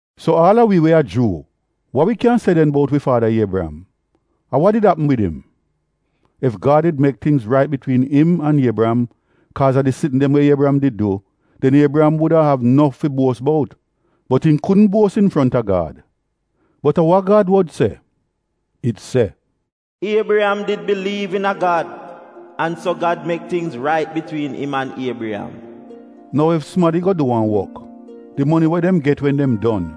So aal a wi we a Juu, wa wi kyan se den bout wi faada Iebriyam? A wa did apm wid im? Ef Gad did mek tingz rait bitwiin im an Iebriyam, kaaz a di sitn dem we Iebriyam did du, den Iebriyam wuda av nof fi buos bout, bot im kudn buos infronta Gad. Bot a wa Gad wod se? It se “Iebriyam did biliiv iina Gad an so Gad mek tingz rait bitwiin im an Iebriyam.” Nou ef sumadi go du wan wok, di moni we dem get wen dem don,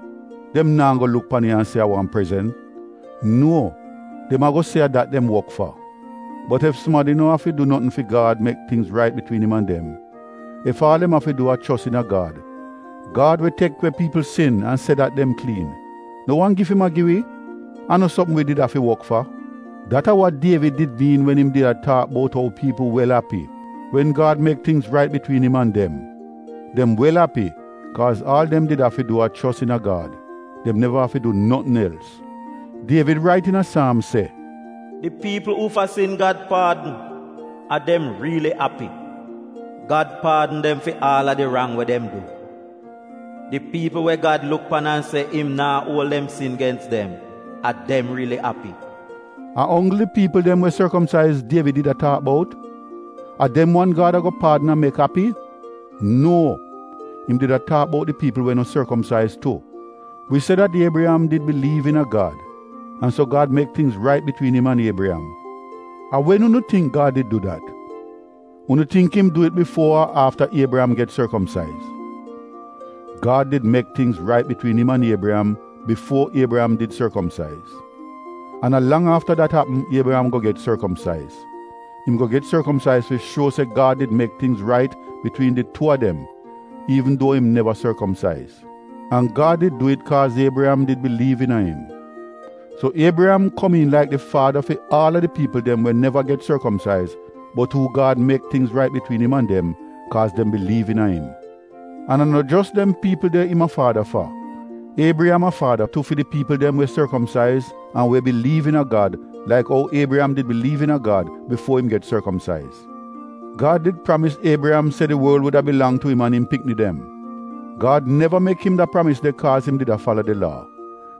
dem naa go luk pan it an se a wan prezent. Nuo, dem ago se a dat dem wok fa. Bot ef sumadi no afi du notn fi Gad mek tingz rait bitwiin im an dem, ef aal dem afi du a chos iina Gad, Gad we tek we piipl sin an se dat dem kliin, no wan gif im a gi wi? A no sopm wi did afi wok fa. Dat a wa Dievid did miin wen im did a taak bout ou piipl wel api wen Gad mek tingz rait bitwiin im an dem. Dem wel api kaaz aal dem did afi du a chos iina Gad, dem neva afi du notn els. Dievid rait iina Saamz se: “Di piipl uufa sin Gad paadn, a dem riili api. Gad paadn dem fi aal a di rang we dem du. Di piipl we Gad luk pan an se im naa uol dem sin gens dem, a dem riili api.” A onggl di piipl dem we sorkomsaiz Dievid did a taak bout? A dem wan Gad ago paadn an mek api? Nuo, im did a taak bout di piipl we no sorkomsaiz tu. Wi se dat Iebriyam did biliiv iina Gad an so Gad mek tingz rait bitwiin im an Iebriyam. A wen unu tingk Gad did du dat? Unu tingk im du it bifuo ar afta Iebriyam get sorkomsaiz? Gad did mek tingz rait bitwiin im an Iebriyam bifuo Iebriyam did sorkomsaiz. An a lang afta dat apm Iebriyam go get sorkomsaiz. Im go get sorkomsaiz fi shuo se Gad did mek tingz rait bitwiin di tuu a dem iivn duo im neva sorkomsaiz, an Gad did du it kaaz Iebriyam did biliiv iina im. So Iebriyam komiin laik di faada fi aal a di piipl dem we neva get sorkomsaiz bot uu Gad mek tingz rait bitwiin im an dem kaaz dem biliiv iina im. An a no jos dem piipl de im a faada fa, Iebriyam a faada tu fi di piipl dem we sorkomsaiz an we biliiv iina Gad laik ou Iebriyam did biliiv iina Gad bifuo im get sorkomsaiz. Gad did pramis Iebriyam se di worl wuda bilang tu im an im pikni dem. Gad neva mek im da pramis de kaaz im did a fala di Laa,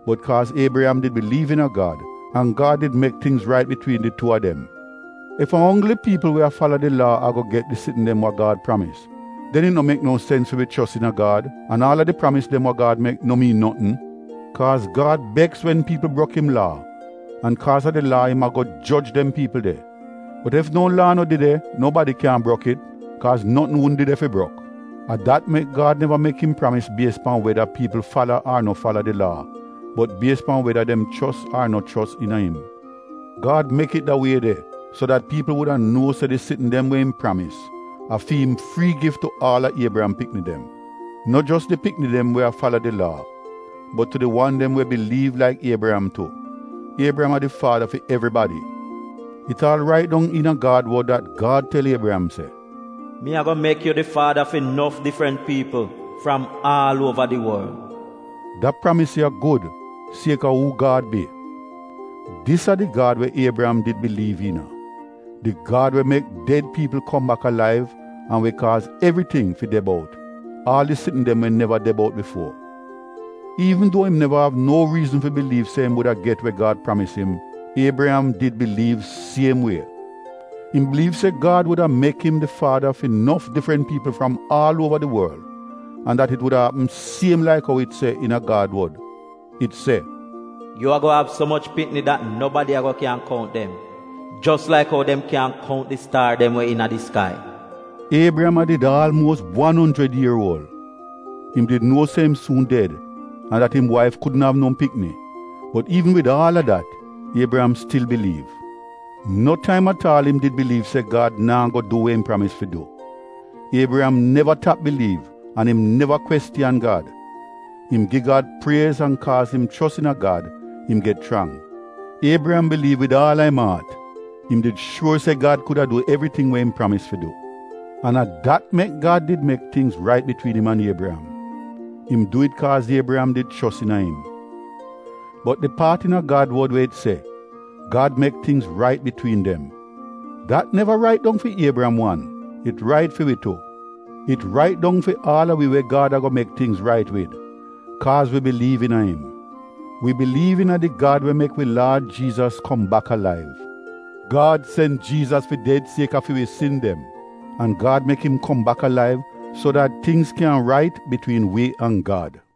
bot kaaz Iebriyam did biliiv iina Gad an Gad did mek tingz rait bitwiin di tuu a dem. Ef a onggl di piipl we a fala di Laa ago get di sitn dem wa Gad pramis, den it no mek no sens fi wi chos iina Gad an aal a di pramis dem we Gad mek, no miin notn. Kaaz Gad beks wen piipl brok im Laa, an kaaz a di Laa im ago joj dem piipl de. Bot ef no laa no de de, nobadi kyan brok it, kaaz notn wudn de de fi brok. A dat mek Gad neva mek im pramis bies pan weda piipl fala ar no fala di Laa, bot bies pan weda dem chos ar no chos iina im. Gad mek it da wie de so dat piipl wuda nuo se di sitn dem we im pramis a fi im frii gif tu aal a Iebriyam pikni dem. No jos di pikni dem we a fala di Laa bot tu di wan dem we biliiv laik Iebriyam tu. Iebriyam a di faada fi evribadi. It aal rait dong iina Gad wod dat Gad tel Iebriyam se, “Mi ago mek yu di faada fi nof difrant piipl fram aal uova di worl.” Da pramis ya, gud, sieka uu Gad bi. Dis a di Gad we Iebriyam did biliiv iina, di Gad we mek ded piipl kom bak alaiv an we kaaz evriting fi de bout, aal di sitn dem we neva de bout bifuo. Iivn duo im neva av no riizn fi biliiv se im wuda get we Gad pramis im, Iebriyam did biliiv siem wie. Im biliiv se Gad wuda mek im di faada fi nof difrant piipl fram aal uova di worl an dat it wuda apm siem laik ou it se iina Gad wod. It se, “Yu ago av so moch pikni dat nobadi ago kyan kount dem jos laik ou dem kyaahn kount di staar dem we iina di skai.” Iebriyam a did aalmuos wan onjrid ier uol, im did nuo se im suun ded an dat im waif kudn av no pikni, bot iivn wid aal a dat Iebriyam stil biliiv. No taim at aal im did biliiv se Gad naa go du we im pramis fi du. Iebriyam neva tap biliiv an im neva kwestiyan Gad. Im gi Gad priez an kaaz im chos iina Gad, im get chrang. Iebriyam biliiv wid aal a im aat, im did shuor se Gad kuda du evriting we im pramis fi du. An a dat mek Gad did mek tingz rait bitwiin im an Iebriyam. Im du it kaaz Iebriyam did chos iina im. Bot di paat iina Gad wod we it se, “Gad mek tingz rait bitwiin dem,” dat neva rait dong fi Iebriyam wan, it rait fi wi tu. It rait dong fi aal a wi we Gad ago mek tingz rait wid kaaz wi biliiv iina im. Wi biliiv iina di Gad we mek wi Laad Jiizas kom bak alaiv. Gad sen Jiizas fi ded sieka fi wi sin dem an Gad mek im kom bak alaiv so dat tingz kyan rait bitwiin wi an Gad.